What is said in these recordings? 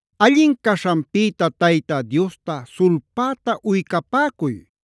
Allin caśhanpïta Tayta Diosta sulpäta uycapäcuy.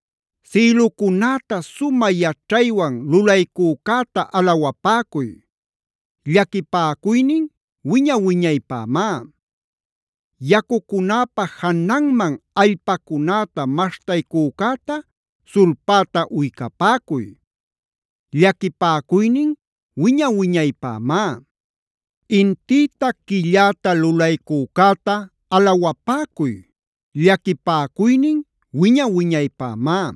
Sïlucunäta sumä yaćhaywan lulaycücäta alawapäcuy.b Llaquipäcuynin wiña-wiñaypämá. Yacucunäpa jananman allpacunäta maśhtaycücäta sulpäta uycapäcuy.c Llaquipäcuynin wiña-wiñaypämá. Intïta, quilläta lulaycücäta alawapäcuy. Llaquipäcuynin wiña-wiñaypämá.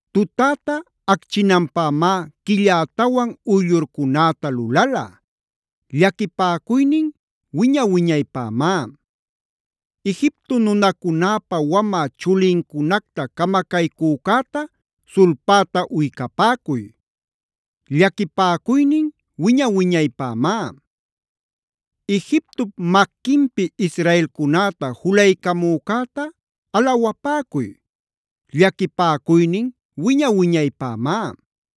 Tutäta acchinanpämá quillätawan uyllurcunäta lulala.d Llaquipäcuynin wiña-wiñaypämá. Egipto nunacunäpa wamä chulincunacta camacaycücäta sulpäta uycapäcuy.e Llaquipäcuynin wiña-wiñaypämá. Egiptop maquinpi Israelcunäta julaycamücäta alawapäcuy.f Llaquipäcuynin wiña-wiñaypämá.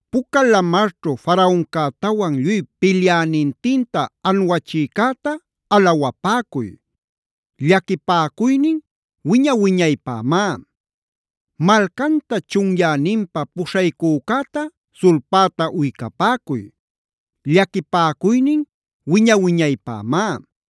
Puca Lamarćhu Faraoncätawan lluy pilyänintinta anuachïcäta alawapäcuy.g Llaquipäcuynin wiña-wiñaypämá. Malcanta chunyäninpa puśhaycücäta sulpäta uycapäcuy.h Llaquipäcuynin wiña-wiñaypämá.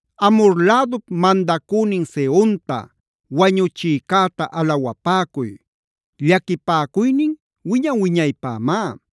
Amhor lädup mandacünin Sehonta wañuchïcäta alawapäcuy.i Llaquipäcuynin wiña-wiñaypämá.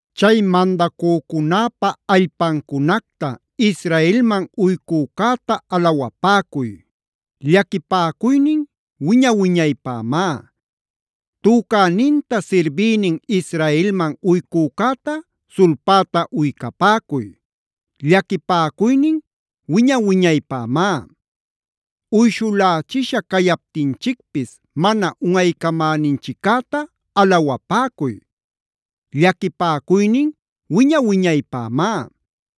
Chay mandacücunäpa allpancunacta Israelman uycücäta alawapäcuy. Llaquipäcuynin wiña-wiñaypämá. Tücäninta sirbïnin Israelman uycücäta sulpäta uycapäcuy. Llaquipäcuynin wiña-wiñaypämá. Uyshulächisha cayaptinchicpis mana unꞌaycamäninchiccäta alawapäcuy. Llaquipäcuynin wiña-wiñaypämá.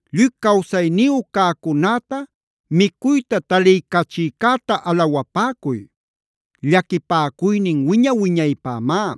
Lluy cawsayniyu cäcunäta micuyta taliycachïcäta alawapäcuy. Llaquipäcuynin wiña-wiñaypämá.